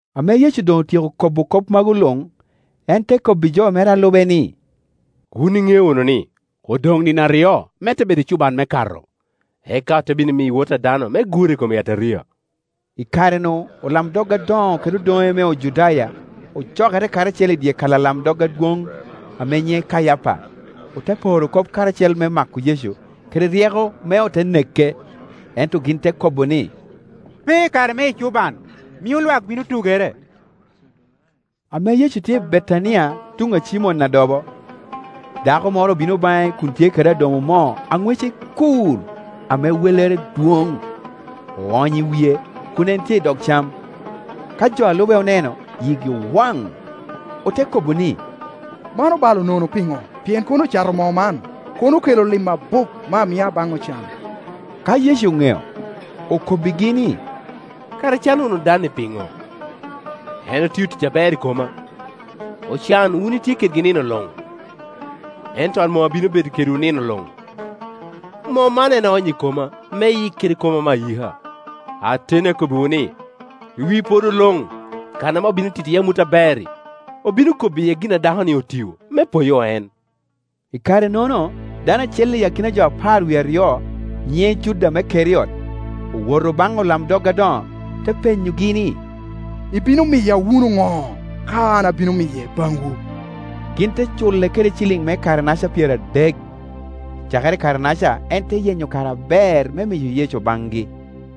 Ame Yecu doŋ otyeko kobo kop magu luŋ, en te kobbi jo mere a lube ni, “Wun iŋeo wunu ni odoŋ nino aryo me te bedo ecuban me Kato, eka ote bino miyo Wot a dano me gure i kom yataria.” I kare-nu olamdog adoŋo kede odoŋe me Ojudaya ocokere karacel i dyekal alamdog adwoŋ ame nyiŋe Kayapa, ote poro kop karacel me mako Yecu kede ryeko me ote neke. Ento gin te kobo ni, “Pe i kare me ecuban, mio lwak bino tugere.” Ame Yecu tye i Betania tuŋ a Cimon adobo, dako moro obino baŋe kun tye kede adomo moo a ŋwece kur ame wellere dwoŋ, oonyo i wie kun en tye i dog cam. Ka jo a lube oneno, yigi owaŋ, ote kobo ni, “Man obalo nono piŋo? Pien kono ocato moo man, kono okelo lim abup me amia baŋ ocan.” Ka Yecu oŋeo, okobbigi ni, “Kara icano wunu dan-ni piŋo? En otio tic aber i koma. Ocan itye wunu kedgi nino luŋ, ento an mom abino bedo kedwu nino luŋ. Moo man en oonyo i koma me eyik kede koma me ayika. Ateni akobbiwu ni, i wi podo luŋ kan ame obino tito iye amut aber-ri, obino kobo iye gin a dako-ni otio, me poyo en.” I kare-nono dano acel i akina jo apar wie aryo, nyiŋe Juda me Keriot, owoto baŋ olamdog adoŋo, te penyogi ni, “Ibino miya wunu ŋo, ka an abino miye baŋwu?” Gin te cule kede ciliŋ me kare naca pyeradek. Cakere i kare-naca en te yenyo kare aber me miyo Yecu baŋgi.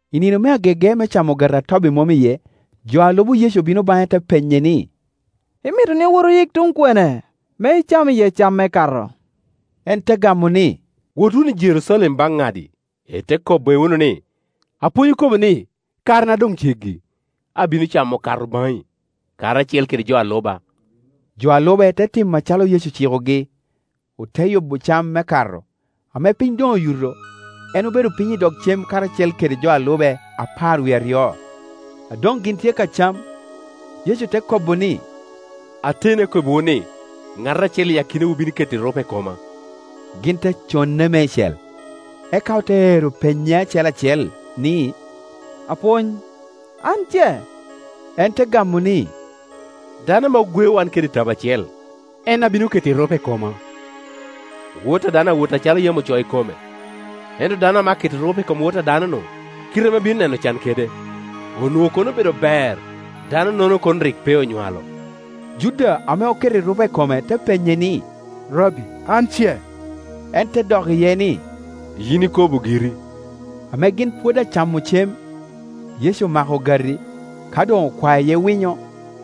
I nino me agege me camo Ogati a Tobi Mom iye, jo a lubo Yecu obino baŋe te penye ni, “Imito ni owot oyik tuŋ kwene me icam iye cam me Kato?” En te gamo ni, “Wot wunu i Jerucalem baŋ ŋadi ite kobbe wunu ni, ‘Apwony okobo ni, karena doŋ ceggi. Abino camo Kato baŋi, karacel kede jo a luba.’” Jo a lube te timo acalo Yecu ocikogi, ote yubo cam me Kato. Ame piny doŋ oyuto, en obedo piny i dog cem karacel kede jo a lube apar wie aryo. A doŋ gin tye ka cam, Yecu te kobo ni, “Ateni akobbiwu ni, ŋat acel i akinawu bino keto erupe i koma.” Gin te conne meicel, eka ote ero penye acel acel ni, “Apwony, an ce?” En te gamo ni, “Dano ame ogweo wan kede i tabo acel, en a bino keto erupe i koma. Wot a dano awot acalo yam ocoo i kome; ento dano ame aketo erupe i kom Wot a dano-nu, kite ame ebino neno can kede! Onwoŋo kono obedo ber, dano-nono kono rik pe onywalo.” Juda ame oketo erupe i kome te penye ni, “Rabbi, an ce?” En te dok iye ni, “Yin ikobo giri.” Ame gin pwod acamo cem, Yecu omako ogati; ka doŋ okwao iye winyo,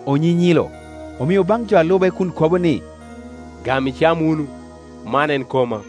onyinyilo, omio baŋ jo a lube kun kobo ni, “Gam icam wunu, man en koma.”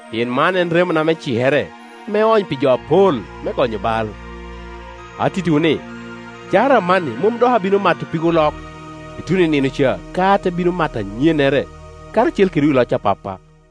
pien man en remona me cikere, ame oony pi jo apol me gonyo bal. Atittiwu ni, cakere amanni, mom dok abino mato pig olok, ituno i nino ca ka ate bino mato anyennere karacel kedwu i loc a Pappa.”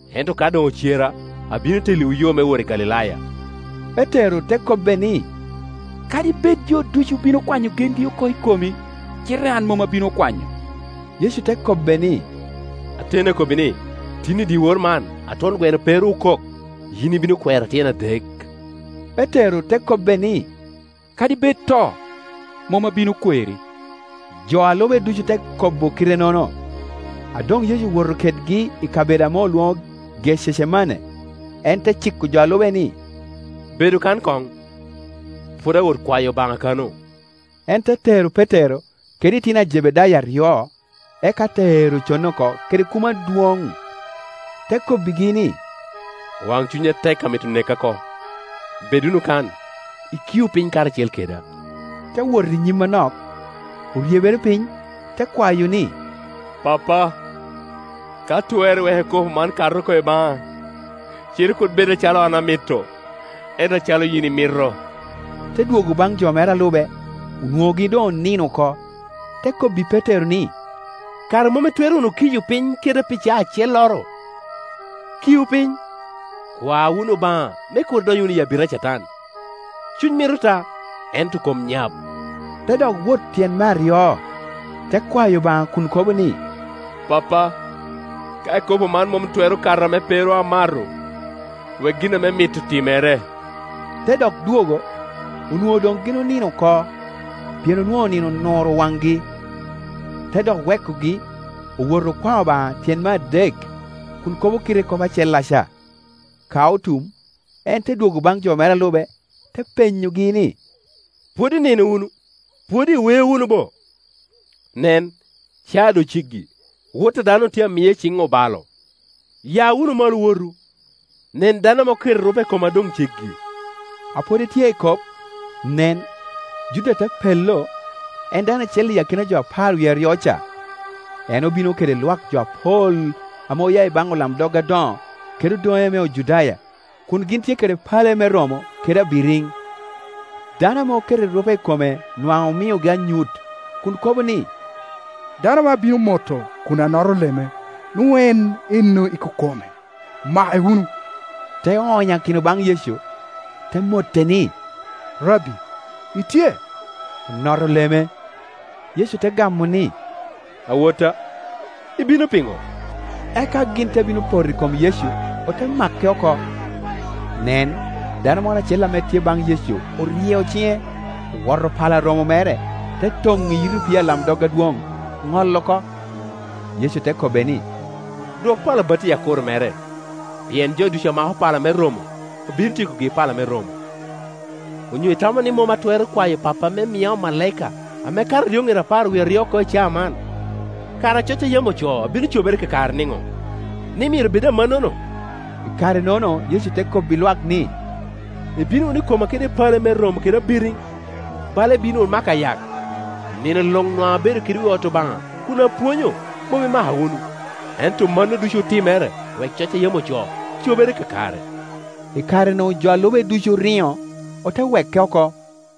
Ento ka doŋ ocera, abino telliwu yo me wot i Galilaya.” Petero te kobbe ni, “Kadi bed jo ducu bino kwanyo gengi oko i komi, cite an mom abino kwanyo.” Yecu te kobbe ni, “Ateni akobbi ni, tin, i dyewor man, a twon gweno pe ru okok, yin ibino kwera tyen adek.” Petero te kobbe ni, “Kadi bed to, mom abino kweri.” Jo a lube ducu te kobo kite-nono. A doŋ Yecu owoto kedgi i kabedo ame olwoŋo Gececemane, en te ciko jo a lube ni, “Bedu kan koŋ, pwod awot kwayo Obaŋa kano.” En te tero Petero kede itino a Jebedayo aryo, eka te ero conne oko kede kumo adwoŋ. Te kobbigi ni, “Waŋcuny atek amito neka oko. Bed wunu kan, ikiu piny karacel keda.” Te wot i nyim anok, oryebere piny, te kwayo ni, “Pappa, ka twerre, wek ikopo man kat oko i baŋa: cite kur bed acalo an amito, ento acalo yin imito.” Te dwogo baŋ jo mere a lube, onwoŋogi doŋonino oko, te kobbi Petero ni, “Kara mom itwero wunu kiyo piny keda pi caa acelloro? Kiu piny, kwa wunu Obaŋa, me kur idony wunu i abita a Catan. Cuny mito ta, ento kom nyap.” Tedok wot tyen me aryo, te kwayo Obaŋa kun kobo ni, “Pappa, ka ikopo man mom twero kato ame pe ru amato, wek gin ame imito timere.” Te dok dwogo, onwoŋo doŋ gin onino oko, pien onwoŋo nino onuro waŋgi. Te dok wekogi, owoto okwao Obaŋa tyen me adek, kun kobo kite kop acellaca. Ka otum, en te dwogo baŋ jo mere a lube, te penyogi ni, “Pwod inino wunu? Pwod iweo wunu bo? Nen, ca doŋ ceggi, Wot a dano otye a miye iciŋ obalo. Ya wunu malo, owotu. Nen dano ame oketo erupe i koma doŋ ceggi.” A pwod etye ekop, nen, Juda te pello, en dano acel i akina jo apar wie aryo-ca. En obino kede lwak jo apol ame oya ibaŋ olamdog adoŋo kede odoŋe me Ojudaya, kun gin tye kede pale me romo kede abiriŋ. Dano ame oketo erupe i kome nwaŋ omiogi anyut, kun kobo ni, “Dano ame abino moto kun anoto leme, nwoŋo en ennono ikome; make wunu.” Te onyakino baŋ Yecu, te mote ni, “Rabbi, itye?” Onoto leme. Yecu te gamo ni, “Awotta, i bino piŋo?” Eka gin te bino poto i kom Yecu, ote make oko. Nen, dano moro acel ame tye baŋ Yecu oryeo ciŋe, owoto pala romo mere, te toŋo i yit opii alamdog adwoŋ, ŋolo oko. Yecu te kobbe ni, “Dwok pala batti i akuro mere; pien jo ducu amako pala me romo obino tyekogi i pala me romo. Onyo itamo ni mom atwero kwayo Pappa me mia omalaika ame kato eryoŋet apar wie aryo oko, i caa man? Kara coc a yam ocoo bino cobere kakare niŋo, ni myero bed amannono?” I kare-nono Yecu te kobbi lwak ni, “Ibino wunu i koma kede pale me romo kede abiriŋ, bala ibino wunu mako ayak? Nino luŋ nwaŋ abedo kedwu i ot Obaŋa kun apwonyo, mom imaka wunu. Ento mano ducu otimere wek coc a yam ocoo cobere kakare.” I kare-nu jo a lube ducu oriŋo, ote weke oko.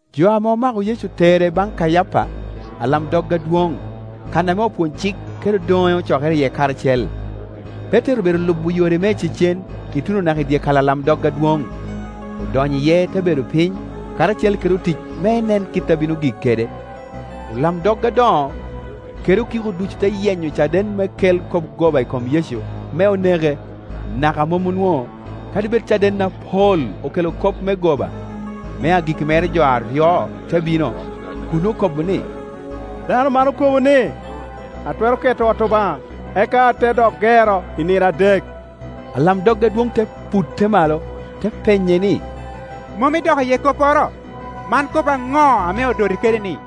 Jo ame omako Yecu otere baŋ Kayapa, alamdog adwoŋ, kan ame opwony-cik kede odoŋe ocokere iye karacel. Petero obedo lubo yore me icecen ituno naka i dyekal alamdog adwoŋ. Odonyo iye te bedo piny karacel kede otic me enen kit a bino gik kede. Olamdog adoŋo kede okiko ducu te yenyo caden me kel kop goba i kom Yecu me oneke, naka mom onwoŋo, kadi bed caden apol okelo kop me goba. Me agikki mere jo aryo te bino, kun okobo ni, “Dano man okobo ni, ‘Atwero ke to ot Obaŋa, eka ate dok gero i nino adek.’” Alamdog adwoŋ te putte malo, te penye ni, “Mom idok iye kopporo? Man kop aŋo ame odoti kede-ni?”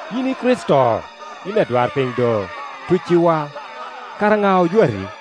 “Yin i Kricito, yin adwarpiny do, tucciwa! Kara ŋa ojwati?”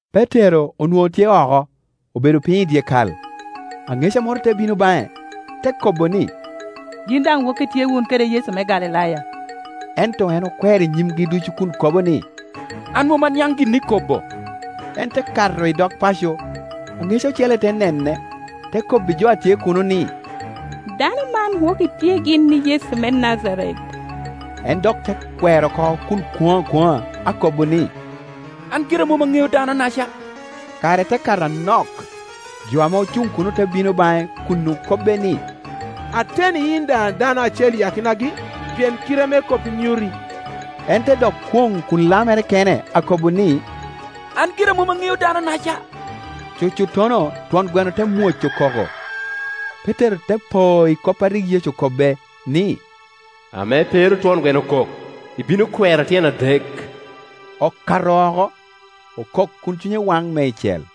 Petero onwoŋo tye oko, obedo piny i dyekal. Aŋeca moro te bino baŋe, te kobo ni, “Yin daŋ woki itye wun kede Yecu me Galilaya.” Ento en okwero i nyimgi ducu kun kobo ni, “An mom aniaŋ gin ikobo.” En te kato i dog paco, aŋeca ocele te nene te kobbi jo a tye kuno ni, “Dano man woki tye gin i Yecu me Najaret.” En dok te kwero oko kun kwoŋo akwoŋa, akobo ni, “An gira mom aŋeo dano-naca.” Kare te kato anok, jo ame ocuŋ kuno te bino baŋe kun okobbe ni, “Ateni yin daŋ dano acel i akinagi, pien kite me koppi nyuti.” En te dok kwoŋ kun lamere kene akobo ni, “An gira mom aŋeo dano-naca.” Cucuttono twon gweno te mwoco koko. Petero te po i kop a rik Yecu okobbe, ni, “Ame pe ru twon gweno okok, ibino kwera tyen adek.” Okato oko, okok kun cunye waŋ meicel.